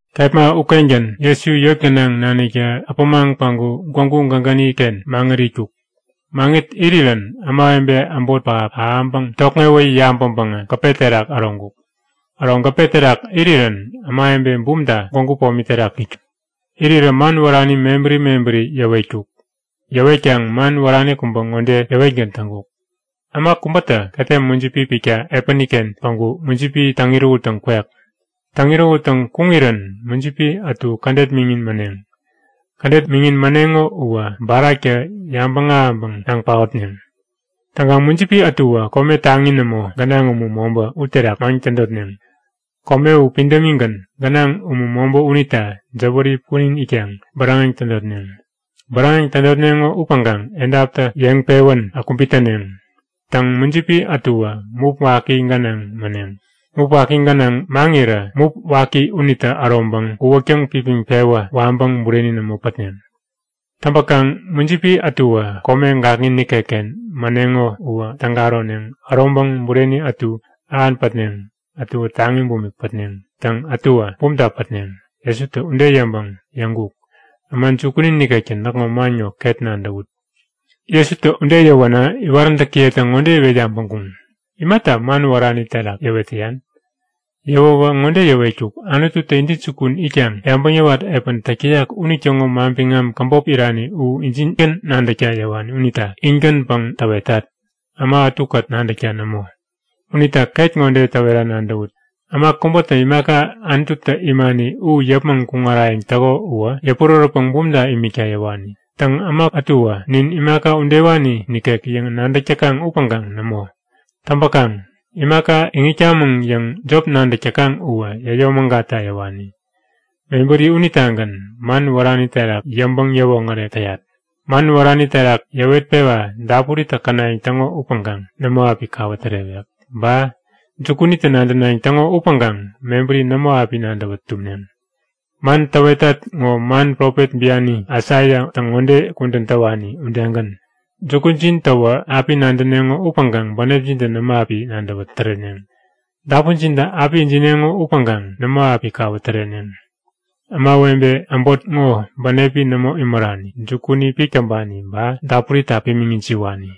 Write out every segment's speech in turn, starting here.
Kepma ukengän Jesu yot gänaŋ naniktä äpämaŋ päŋku gwägu gägäni-ken maŋit itkuk. Maŋit irirän ämawebe äbot pähap ahäŋpäŋ tokŋewä yabäŋpäŋä gäpe terak äroŋkuk. Äro gäpe terak irirän ämawebe bumta gwägu pomi terak itkuŋ. Irirä man wärani mebäri mebäri yäwetkuk. Yäwetkaŋ man wärani kubä ŋode yäwetgän täŋkuk; Äma kubätä ketem mujipi pikta epäni-ken päŋku mujipi täŋ-irähuttäŋ kwek. Täŋ-irähuttäŋ kuŋirän mujipi ätu kädet miŋin mäneŋ. Kädet miŋin mäneŋo uwä baraktä yabäŋ ahäŋpäŋ naŋ paotneŋ. Täŋkaŋ mujipi ätuwä kome taŋi nämo, gänaŋ umu mobä, uterak maŋ tädotneŋ. Kome u pidämigän, gänaŋ umu mobä unita jäwäri punin itkaŋ bäräŋeŋ tädotneŋ. Bäräŋeŋ tädotneŋo upäŋkaŋ edaptä yeŋpewän kubit täneŋ. Täŋ, mujipi ätuwä mup waki gänaŋ mäneŋ. Mup waki gänaŋ maŋirä mup waki unitä äroŋpäŋ uwäk täŋpipiŋ-pewä waŋpäŋ bureni nämo pätneŋ. Täŋpäkaŋ mujipi ätuwä kome gakŋi nikekken mäneŋo uwä täga äroneŋ. Äroŋpäŋ bureni ätu ähan pätneŋ. Ätuwä taŋi bumik pätneŋ. Täŋ, ätuwä bumta pätneŋ. Jesutä ude yäŋpäŋ yäŋkuk; Äma jukuni nikektä näkŋo man ŋo ket nadäwut! Jesutä ude yäwänä iwaräntäkiyetä ŋode iwet yabäŋkuŋ; Imata man wärani terak yäwet täyan? Yäwäwä ŋode yäwetkuk; Anututä intäjukun itkaŋ yabäŋ yäwat epän täk täyak unitäŋo manbiŋam käbop irani u injingän nadäkta yäwani unita in-gänpäŋ täwetat. Äma ätukät nadäkta nämo. Unita ket ŋode täwera nadäwut; Äma kubätä imaka Anututä imani u yäpmäŋ kuŋarayäŋ täko uwä yäpurärätpäŋ bumta imikta yäwani. Täŋ, äma ätuwä nin imaka udewani nikek yäŋ nadäk täkaŋ upäŋkaŋ nämo! Täŋpäkaŋ imaka iŋitkamäŋ yäŋ jop nadäk täkaŋ uwä yäyomägatta yäwani. Mebäri unitagän man wärani terak yäŋpäŋ-yäwoŋärek täyat. Man wärani terak yäwetpewa dapuritä känayäŋ täŋo upäŋkaŋ nämo api kawä tärewek. Ba jukunitä nadänayäŋ täŋo upäŋkaŋ mebäri nämo api nadäwä tumneŋ. Man täwetat ŋo man profet biani Aisaiatä ŋode kudän täwani udegän; Jukujin täwä api nadäneŋo upäŋkaŋ bänepjintä nämo api nadäwä täreneŋ. Dapunjintä api ijineŋo upäŋkaŋ nämo api kawä täreneŋ. Ämawebe äbot ŋo bänepi nämo imärani. Jukuni pik täŋpani ba dapurita pimiŋ ijiwani.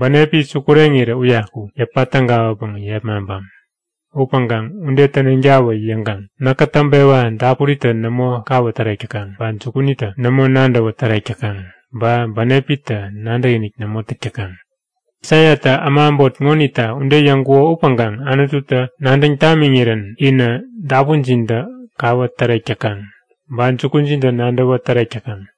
Bänepi sukureŋirä uyaku yäpa tägawäpäŋ yepmaŋpam. Upäŋkaŋ ude täneŋtawä yäŋkaŋ näkä täŋpewa dapuritä nämo kawä tärek täkaŋ ba jukunitä nämo nadäwä tärek täkaŋ, ba bänepitä nadäkinik nämo täk täkaŋ. Aisaiatä äma äbot ŋonita ude yäŋkuko upäŋkaŋ Anututä nadäŋ tamiŋirän inä dapunjintä kawä tärek täkaŋ ba jukujintä nadäwä tärek täkaŋ.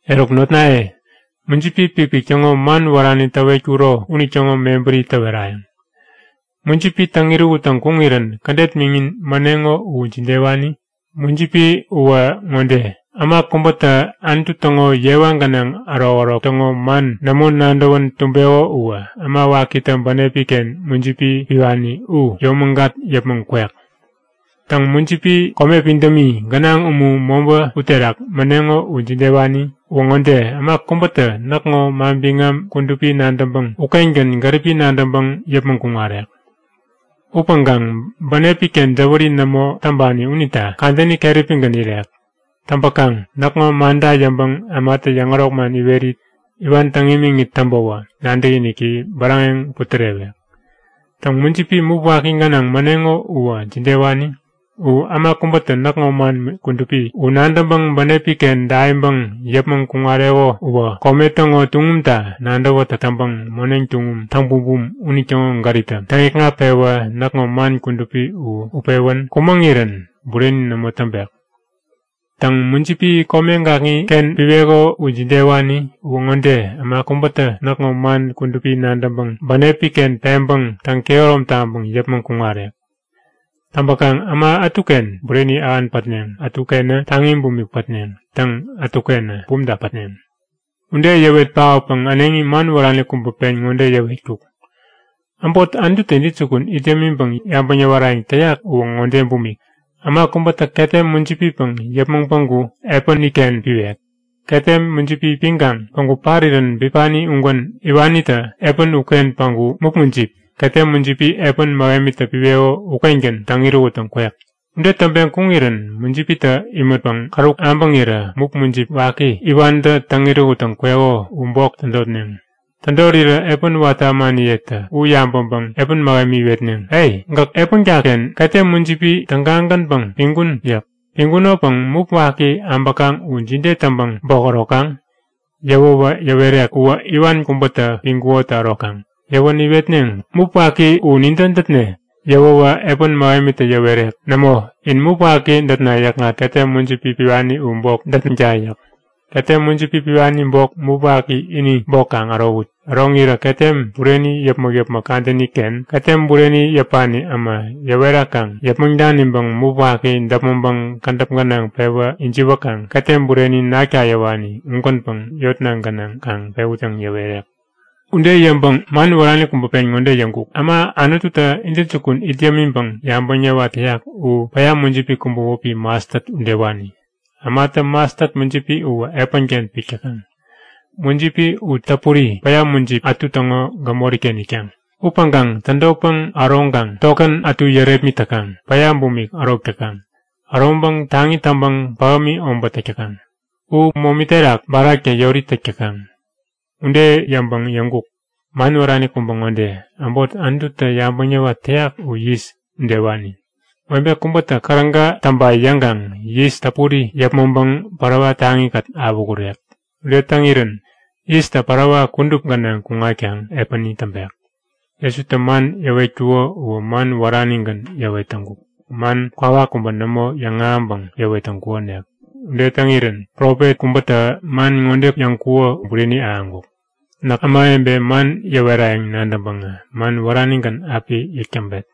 Eruk notnaye, mujipi pikpik täŋo man wärani täwetkuro unitäŋo mebäri täwerayäŋ. Mujipi täŋ-irähuttäŋ kuŋirän kädet miŋin mäneŋo u jidewani? Mujipi uwä ŋode; Äma kubätä Anutu täŋo yewa gänaŋ ärokärok täŋo man nämo nadäwän tumbeko uwä äma wakitä bänepi-ken mujipi piwani u yomägat yäpmäŋ kwek. Täŋ, mujipi kome pidämi, gänaŋ umu mobä uterak mäneŋo u jidewani? Uwä ŋode; Äma kubätä näkŋo manbiŋam kudupi nadäŋpäŋ ukengän gäripi nadäŋpäŋ yäpmäŋ kuŋarek. Upäŋkaŋ bänepi-ken jäwäri nämo täŋpani unita kadäni keräpigän irek. Täŋpäkaŋ näkŋo manta yäŋpäŋ ämatä yäŋärok man iwerit iwan täŋ imiŋit täŋpäwä, nadäkiniki bäräŋeŋ putärewek. Täŋ, mujipi mup waki gänaŋ mäneŋo u jidewani? U äma kubätä näkŋo man kudupi u nadäŋpäŋ bänepi-ken daiŋpäŋ yäpmäŋ kuŋareko uwä kome täŋo tuŋumta nadäwätäk täŋpäŋ moneŋ tuŋum täŋbumbum unitäŋo gäriptä täŋikŋat-pewä näkŋo man kudupi u utpewän kumäŋirän bureni nämo täŋpek. Täŋ, mujipi kome gakŋiken piweko u jidewani? Uwä ŋode; Äma kubätä näkŋo man kudupi nadäŋpäŋ bänepi-ken peŋpäŋ täŋkehärom taŋpäŋ yäpmäŋ kuŋarek. Täŋpäkaŋ äma ätuken bureni ähan pätneŋ. Ätukenä taŋi bumik pätneŋ. Täŋ, ätukenä bumta pätneŋ. Ude yäwet paotpäŋ äneŋi man wärani kubä pen ŋode yäwetkuk; Äbot Anututä intäjukun it yämiŋpäŋ yabäŋ yäwarayäŋ täyak uwä ŋode bumik; Äma kubätä ketem mujipipäŋ yäpmäŋ päŋku epäni-ken piwek. Ketem mujipi piŋkaŋ päŋku parirän bipani ugän iwanitä epän uken päŋku mup mujip, ketem mujipi epän mähemitä piweko ukengän täŋ-irähuttäŋ kwek. Ude täŋpeŋ kuŋirän mujipitä imätpäŋ käruk äbäŋirä mup mujip waki iwantä täŋ-irähuttäŋ kweko u bok tädotneŋ. Tädorirä epän watä ämaniyetä u yabäŋpäŋ epän mähemi iwetneŋ; E! Gäk epänka-ken ketem mujipi tägagänpäŋ piŋkun yäk. Piŋkunopäŋ mup waki äbäkaŋ u jide täŋpäŋ bok ärokaŋ? Yäwäwä yäwerek; Uwä iwan kubätä piŋkukotä ärokaŋ. Yäwänä iwetneŋ; Mup waki u nintä dätne? Yäwäwä epän mähemitä yäwerek; Nämo! In mup waki dätna yäkŋat ketem mujipi piwani u bok dätneŋta yäk. Ketem mujipi piwani bok mup waki ini bok kaŋ ärowut. Äroŋirä ketem bureni yäpmäk-yäpmäk kadäni-ken ketem bureni yäpani äma yäwerakaŋ yäpmäŋ daniŋpäŋ mup waki däpmäŋpäŋ kädäp gänaŋ pewä ijiwäkaŋ ketem bureni nakta yäwani ugänpäŋ yotna gänaŋ kaŋ pewut yäŋ yäwerek. Ude yäŋpäŋ man wärani kubä pen ŋode yäŋkuk; Äbot Anututä intäjukun it yämiŋpäŋ yabäŋ yäwat täyak u päya mujipi kubä wäpi mastat udewani. Ämatä mastat mujipi uwä epänken pik täkaŋ. Mujipi u täpuri, päya mujipi ätu täŋo gämori-ken itkaŋ. Upäŋkaŋ tädotpäŋ äroŋkaŋ tokän ätu yärepmit täkaŋ, päya bumik ärok täkaŋ. Äroŋpäŋ taŋi täŋpäŋ pähämi obät täk täkaŋ. U momi terak baraktä yori täk täkaŋ. Ude yäŋpäŋ yäŋkuk; Man wärani kubä ŋode. Äbot Anututä yabäŋ yäwat täyak u yis udewani. Webe kubätä käräga täŋpa yäŋkaŋ yis täpuri yäpmäŋpäŋ parawa taŋi-kät awähurek. Ude täŋirän yistä parawa kudup gänaŋ kuŋatkaŋ epäni täŋpek. Jesutä man yäwet täŋkuko uwä man wäranigän yäwet täŋkuk. Man kwawak kubä nämo yäŋahäŋpäŋ yäwet täŋkukonik. Ude täŋirän profet kubätä man ŋode yäŋkuko u bureni ahäŋkuk; Näk ämawebe man yäwerayäŋ nadäŋpäŋä man wäranigän api yäk täŋpet.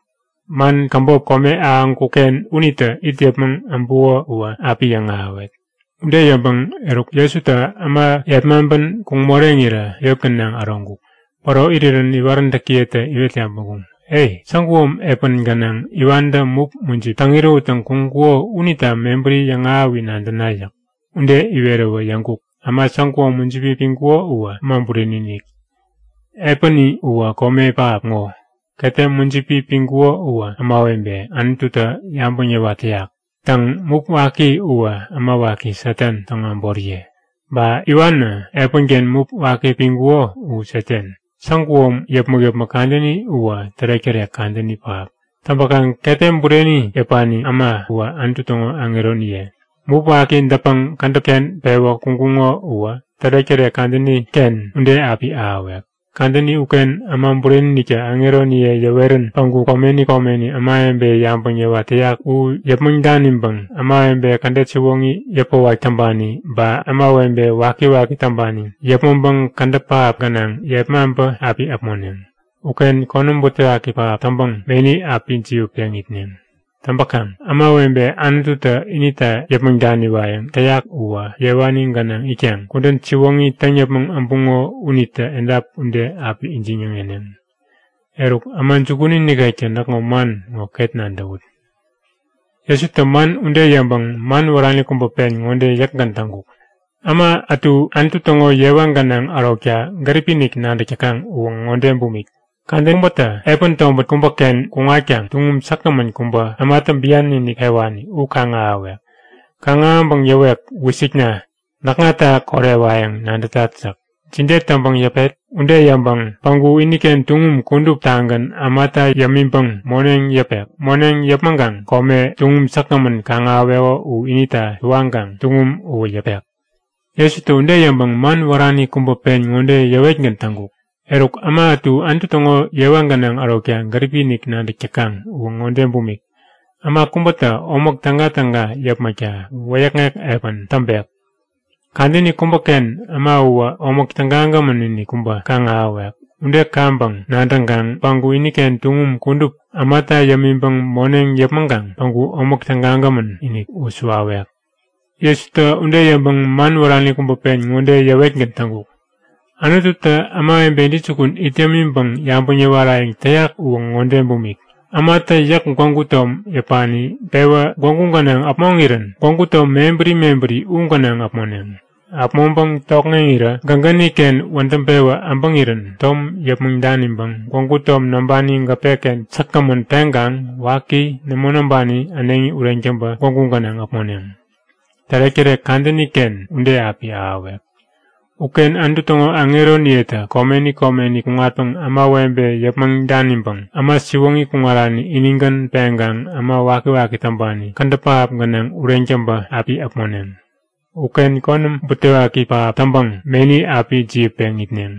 Man käbop kome ahäŋkuk-ken unitä it yäpmäŋ äbuko uwä api yäŋahäwet. Ude yäŋpäŋ eruk Jesutä äma yepmaŋpän kuŋ moreŋirä yot gänaŋ äroŋkuk. Päro irirän iwaräntäkiyetä iwet yabäŋkuŋ; E! Saguom epän gänaŋ iwantä mup mujip täŋ-irähuttäŋ kuŋkuko unita mebäri yäŋahäwi nadäna yäk. Ude iweräwä yäŋkuk; Äma säguom mujipi piŋkuko uwä Äma Bureni-inik. Epäni uwä kome pähap ŋo. Ketem mujipi piŋkuko uwä ämawebe Anututä yabäŋ yäwat täyak. Täŋ, mup waki uwä äma waki Satan täŋo äboriye. Ba iwanä, epänken mup waki piŋkuko u Satan. Saguom yäpmäk-yäpmäk kadäni uwä tärek-tärek kadäni pähap. Täŋpäkaŋ ketem bureni yäpani äma uwä Anutu täŋo aŋeroniye. Mup waki dätpäŋ kädäp-ken pewä kuŋkuŋo uwä tärek-tärek kadäni-ken ude api ahäwek. Kadäni uken Äma Bureni-iniktä aŋeroniye yäwerän päŋku komeni komeni ämawebe yabäŋ yäwat täyak u yäpmäŋ daniŋpäŋ ämawebe kädet siwoŋi yäpäwak täŋpani ba ämawebe wakiwaki täŋpani yäpmäŋpäŋ kädäp pähap gänaŋ yepmaŋpä api äpmoneŋ. Uken konäm butewaki pähap täŋpäŋ meni api jiwätpeŋ itneŋ. Täŋpäkaŋ ämawebe Anututä inita yäpmäŋ daniwayäŋ täyak uwä yewani gänaŋ itkaŋ kudän siwoŋi täŋ yäpmäŋ äbuŋo unitä edap ude api ijiŋ-yäŋeneŋ. Eruk, äma jukuni nikektä näkŋo man ŋo ket nadäwut! Jesutä man ude yäŋpäŋ man wärani kubä pen ŋode yäkgän täŋkuk; Äma ätu Anutu täŋo yewa gänaŋ ärokta gäripi-inik nadäk täkaŋ uwä ŋode bumik; Kadäni kubä äma kubätä epän tobät kubäken kuŋatkaŋ tuŋum säkgämän kubä ämatä bian-inik pewani u kaŋ-ahäwek. Kaŋ-ahäŋpäŋ yäwek; Wisikna! Näkŋata korewayäŋ nadätat yäk. Jide täŋpäŋ yäpet? Ude yäŋpäŋ tuŋum u yäpmäŋkaŋ kome ini ukengän äneŋi käbop pewek. Eruk peŋkaŋ päŋku iniken tuŋum kuduptagän ämata yämiŋpäŋ moneŋ yäpek. Moneŋ yäpmäŋkaŋ kome, tuŋum säkgämän kaŋ-ahäweko u inita suwaŋkaŋ tuŋum uwä yäpek. Jesutä ude yäŋpäŋ man wärani kubä pen ŋode yäwetgän täŋkuk; Eruk, äma ätu Anutu täŋo yewa gänaŋ ärokta gäripi-inik nadäk täkaŋ uwä ŋode bumik; Äma kubätä omäk tägatäga yäpmäkta wäyäkŋek epän täŋpek. Kadäni kubäken äma uwä omäk tägagämän-inik kubä kaŋ-ahäwek. Ude kaŋpäŋ nadäŋkaŋ päŋku iniken tuŋum kudup ämata yämiŋpäŋ moneŋ yäpmäŋkaŋ päŋku omäk tägagämän-inik u suwawek. Jesutä ude yäŋpäŋ man wärani kubä pen ŋode yäwetgän täŋkuk; Anututä ämawebe intäjukun it yämiŋpäŋ yabäŋ yäwarayäŋ täyak uwä ŋode bumik; Ämatä yäk gwägu tom yäpani pewä gwägu gänaŋ äpmoŋirän gwägu tom mebäri mebäri u gänaŋ äpmoneŋ. Äpmoŋpäŋ tokŋeŋirä gägäni-ken wädäŋ-pewä äbäŋirän tom yäpmäŋ daniŋpäŋ gwägu tom näŋpani gäpe-ken säkgämän peŋkaŋ waki, nämo näŋpani äneŋi ureŋ täŋpä gwägu gänaŋ äpmoneŋ. Tärektärek kadäni-ken ude api ahäwek. Uken Anutu täŋo aŋeroniyetä komeni komeni kuŋatpäŋ ämawebe yäpmäŋ daniŋpäŋ äma siwoŋi kuŋarani inigän peŋkaŋ äma wakiwaki täŋpani kädäp pähap gänaŋ ureŋ täŋpä api äpmoneŋ. Uken konäm butewaki pähap täŋpäŋ meni api jiwätpeŋ itneŋ.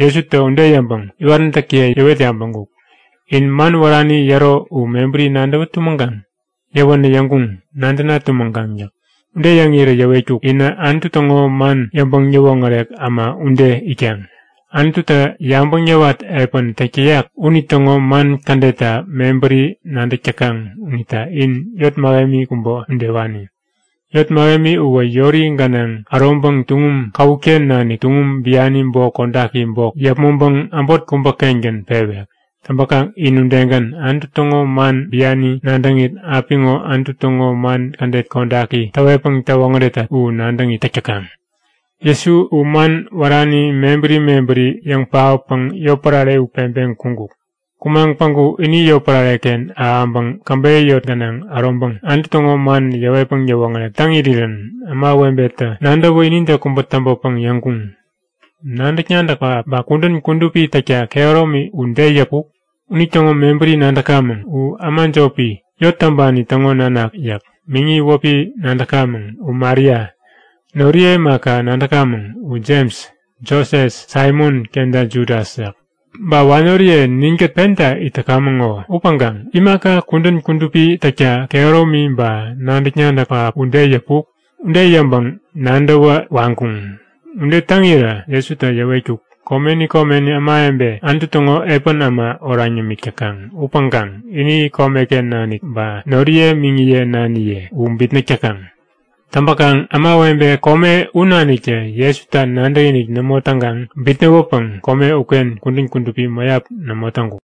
Jesutä ude yäŋpäŋ iwaräntäkiye yäwet yabäŋkuk; In man wärani yäro u mebäri nadäwä tumäŋkaŋ? Yäwänä yäŋkuŋ; Nadäna tumäŋkaŋ yäk. Ude yäŋirä yäwetkuk; Inä Anutu täŋo man yäŋpäŋ-yäwoŋärek äma ude itkaŋ. Anututä yabäŋ yäwat epän täk täyak unitäŋo man kädetta mebäri nadäk täkaŋ unita in yot mähemi kubä udewani. Yot mähemi uwä yori gänaŋ äroŋpäŋ tuŋum käwut-ken nanik tuŋum biani bok kodaki bok yäpmäŋpäŋ äbot kubä-kengän pewek. Täŋpäkaŋ in udegän, Anutu täŋo man biani nadäŋit, apiŋo Anutu täŋo man kädet kodaki täwetpäŋ täwoŋäretat u nadäŋit täk täkaŋ. Jesu u man wärani mebäri mebäri yäŋkä yäŋ paotpäŋ yotpärare u peŋpeŋ kuŋkuk. Kumaŋ päŋku ini yotpärare-ken ahäŋpäŋ käbeyä yot gänaŋ äroŋpäŋ Anutu täŋo man yäwetpäŋ yäwoŋärek täŋirän ämawebetä nadäwä inide kubä täŋpäpäŋ yäŋkuŋ; Nadäk-nadäk pähap ba kudän kudupi täkta kehäromi u de yäpuk? Unitäŋo mebäri nadäkamäŋ. U äma jopi, yot täŋpani täŋo nanak yäk. Miŋi wäpi nadäkamäŋ, u Maria. Noriye imaka, nadäkamäŋ, u Jems, Joses, Saimon kenta Judas yäk. Ba wanoriye ninkät penta it täkamäŋ ŋo. Upäŋkaŋ imaka kudän kudupi täkta kehäromi ba nadäk-nadäk pähap u de yäpuk? Ude yäŋpäŋ nadäwä waŋkuŋ. Ude täŋirä Jesutä yäwetkuk; Komeni komeni ämawebe Anutu täŋo epän äma oraŋ yämik täkaŋ upäŋkaŋ ini komeken nanik ba noriye miŋiye naniye u bitnäk täkaŋ. Täŋpäkaŋ ämawebe kome u naniktä Jesuta nadäkinik nämo täŋkaŋ bitnäwäpäŋ kome uken kudän kudupi mäyap nämo täŋkuk.